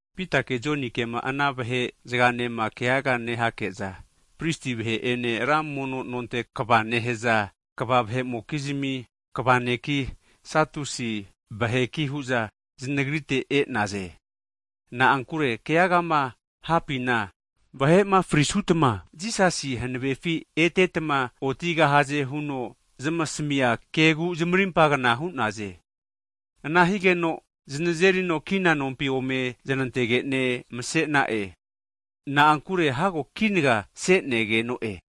Pita'ene Jonikema ana vahe zaganema keaga nehake'za, pristi vahe'ene ra mono nonte kva nehaza kva vahe'mokizmi kva'neki, Sadusi vaheki hu'za znagrite e'naze. Na'ankure keagama hapina, vahe'ma frisutma, Jisasi hanavefi etetma otigahaze hu'ne zamasmi'a kegu zamarimpagna hu'naze. Ana hute'za znazeri'za kina nompi ome zanantage'ne mase'na'e. Na'ankure hago kinaga se'negeno'e.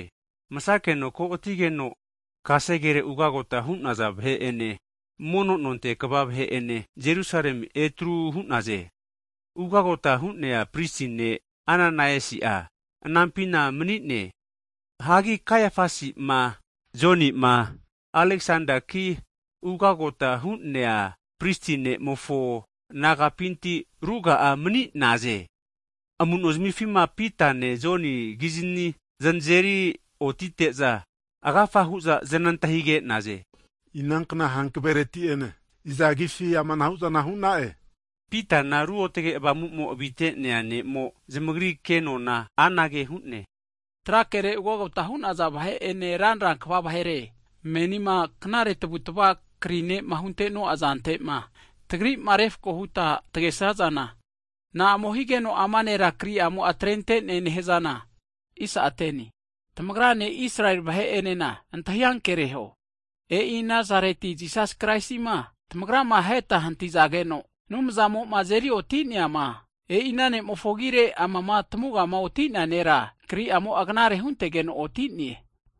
Masakeno ko'atigeno, kasegere ugagota hu'naza vahe'ene mono nonte kva vahe'ene Jerusalemi etru hu'naze. Ugagota hu'nea pristi ne' Ananaisi'a anampina mani'ne. Hagi Kaiafasi'ma Joni'ma Aleksendaki, ugagota hu'nea pristi ne'mofo nagapinti ruga'a mani'naze. Amu'no zamifima Pitane Joni kizni zanzeri otite'za, agafa hu'za znantahige'naze, Inankna hankavereti ene iza agifi amanahu'zana hu'na'e? Pitana Ruotge Avamu'mo avite'nea ne'mo, zamagri kenona anage hu'ne, Tra kere ugagota hu'naza vahe'ene ranra kva vahere, menima knare tavutva'ma kri ne'ma hunte'no'a zantema, tagri'ma refko hutma tagesnazana, na'amo higeno ama nera kri'amo'a atrente'ne nehazana, tamagrane Israeli vahe'enena antahi ankereho. E'i Nazareti Jisas Kraisima tamagrama aheta hantizageno, Anumzamo'ma azeri oti'neama, e'ina ne'mofo agire, amama tamugama oti'nea nera kri'amo'a knare huntegeno oti'ne.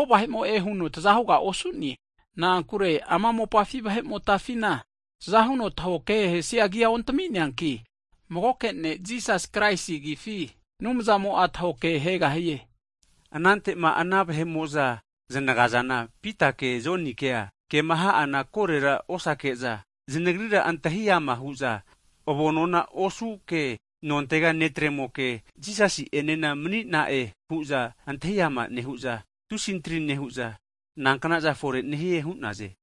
Mago vahe'mo'e huno taza huga osu'ne, na'ankure ama mopafi vahe'motafina, tahokehesia agi'a ontami'neanki, magoke ne' Jisas Kraisi agifi, Anumzamo'a tahokehegahie. Anante'ma ana vahe'mo'za znagazana, Pitake Jonikea, kema ha'ana korera osake'za, zanagrira antahi ama hu'za, avonona osuke, nontega ne'tremoke Jisasi'enena mani'na'e hu'za antahi ama nehu'za tusi antri nehu'za, nankna'za fore nehie hu'naze.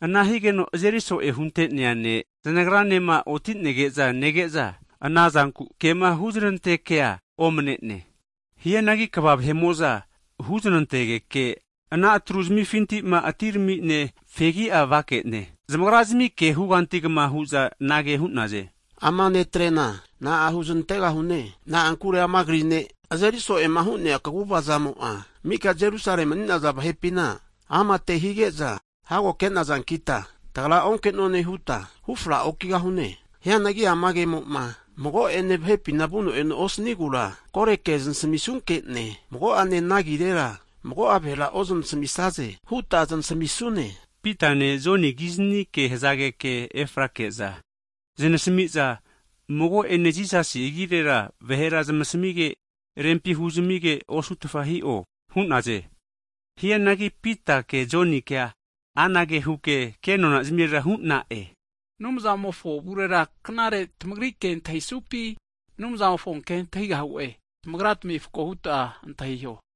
Ana higeno azeri so'e hunte'nea ne', znagranema oti'nege'za nege'za, anazanku kema huznantekea omane'ne. Hianagi kva vahe'mo'za huznantageke ana atru zamifintima atirami'ne fegia vake'ne, zamagrazmi ke hugantugma hu'za, anage hu'naze, Ama netrena na'a huznantegahune? Na'ankure ama kri ne' azeri so'e'ma hu'nea kaguvazamo'a, mika Jerusalemi mani'naza vahe'pina amate hige'za hago ke'nazankita tagra onke'none huta hufra okigahune. Hianagi ama kemo'ma mago'ane vahepima vuno'eno osanigura, kore ke znasamisunke'ne, mago'ane ama ana agirera mago'a vahera ozanasmisaze huta zanasamisune. Pitane, Joninena ke hazageke efrake'za zanasmi'za, Mago ene Jisasi agirera vahera zamasmige, rempi huzamige osutfa hi'o hu'naze. Hianagi Pitake Jonikea, anage huke ke nona zamire hu'na'e, Anumzamofo avurera knare tamagri ke antahisupi, Anumzamofo ke antahigahu'e, tamagratami refako huta antahiho.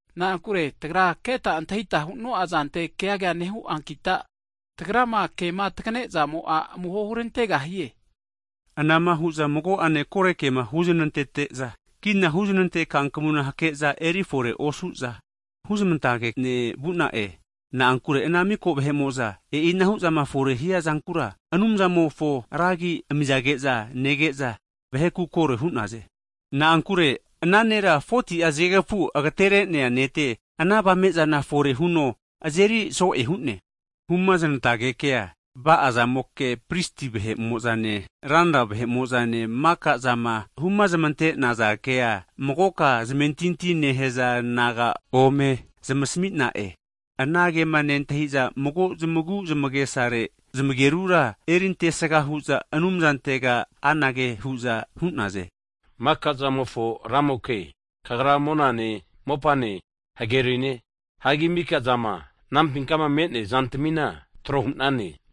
Na'ankure tagra keta antahita huno'a zante keaga nehuankita, tagrama kema tagane'zamo'a amuho hurantegahie. Anama hu'za mago'ane korekema huznantete'za, kina huzanante kankmuna hake'za eri fore osu'za hu'zanantage'ne vu'na'e. Na'ankure ana mika vahe'mo'za e'inahu zama fore hiazankura Anumzamofo ra agi amizage'za nege'za, vaheku koro hu'naze. Na'ankure ana nera 40'a zagekfu agatere'nea nete ana avame'zana fore huno azeri so'e hu'ne. Humaznantagekea, va'azamoke, pristi vahe'mo'zane, ranra vahe'mo'zama maka'zama humaznante'naza kea magoka zamentinti nehaza naga ome zamasmi'na'e. Ana kema nentahi'za, mago zamagu zamagesare zamagerura erintesga hu'za Anumzamofontega anage hu'za hu'naze. Maka'zamofo Ramoke, Kagra monane, mopane, hagerine, hagi mika zama anampinkama me'nea zantamina trohu'nane,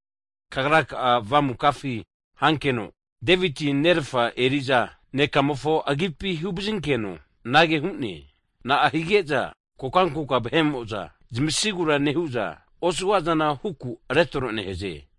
Kagra ka'a Avamukafi hankeno Deviti'a nerafa eri'za ne'kamofo agipi huvazinkeno anage hu'ne, Na'a hige'za kokankoka vahe'mo'za zamasigura nehu'za, osuga'zana huku retro nehaze?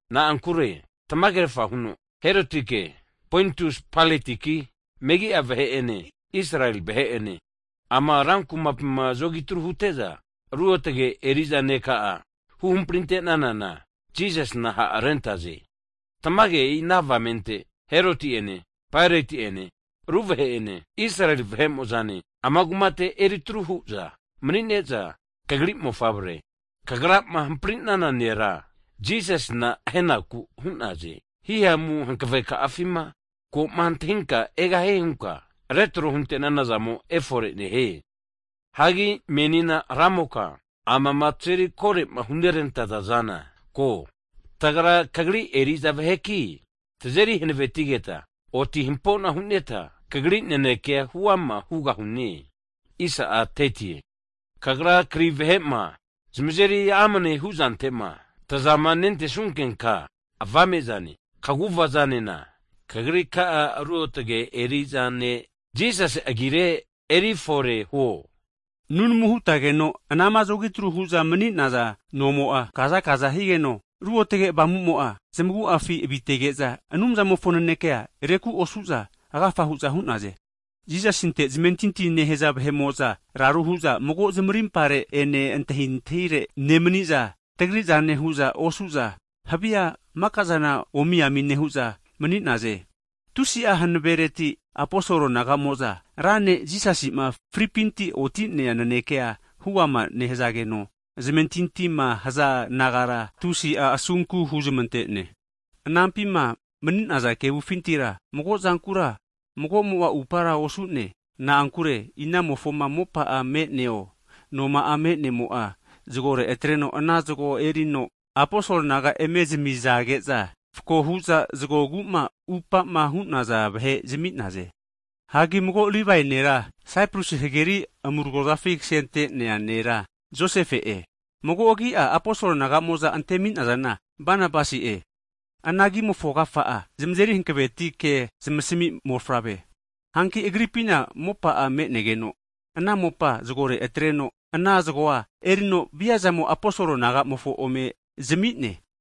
Na'ankure tamagerafa huno Herotiki, Pointus Pailatiki, megi'a vahe'ene, Israeli vahe'ene, ama rankumapina zogitru hute'za, Ruotge eri'za Neka'a huhamprinte'nana Jisasina ha' rente'naze. Tamage e'i ana avamente Heroti'ene Paeroti'ene ru vahe'ene Israel vahe'mo'zane ama kumate eri atru hu'za manine'za kagri mofavre kagrama hampri'nana nera Jisasina ahenaku hu'naze. Himamu hanaveka'afima ko antahinka egahie hunka retro hunte'nana zamo efore hu'ne. Hagi menina Ramoka, amama tazeri kore'ma hunerantaza'zana ko, tagra kagri eri'za vaheki, tazeri hanavetigeta oti hampona huneta Kagri nanekea huama hugahune. Kagraka'a kazana rusutenka kri vahera krizmia eri amne nehunka ruzahu ruzahu kaguvazana Kagri ka'a ruotge eri'za ne' Jisasi agire eri fore huo. Nunamu hutageno, anama zogitru hu'za mani'naza nomo'a kazakaza higeno, ruotge Avamumo'a zamagu'afi avitege'za, Anumzamofo nanekea reku osu'za agafa hu'za hu'naze. Jisasinte zamentinti nehaza vahe'mo'za raru hu'za mago zamarimpare ene antahintahire nemani'za, tagri' zane hu'za osu'za havia mika'zana omiami nehu'za mani'naze. Tusi'a hanavereti aposol naga'mo'za, Ramo'ma Jisasi'ma fripinti oti'nea nanekea huama nehazageno, zamentintima haza nagara Anumzamo'a tusi'a asunku huzmante'ne. Anampima mani'naza kevufintira mago'zankura mago'mo'a upara osu'ne. Na'ankure inamofoma mopa'a me'neo, noma'a me'nemo'a zagore atreno ana zago erino, aposol naga eme zamizage'za, fako hu'za zagogu'ma atupa'ma hu'naza vahe zami'naze. Hagi mago Livae nera, Saiprus hageri amuragozafi kasente'nea nera Josefe'e, mago agi'a aposol naga'mo'za antemi'nazana Banabasi'e. (Ana agimofo agafa'a, zamazeri hankaveti ke zamasmi mofavre hu'ne.) Hanki agripina mopa'a menegeno ana mopa zagore atreno, ana zagoa erino viazamo aposol nagamofo ome zami'ne.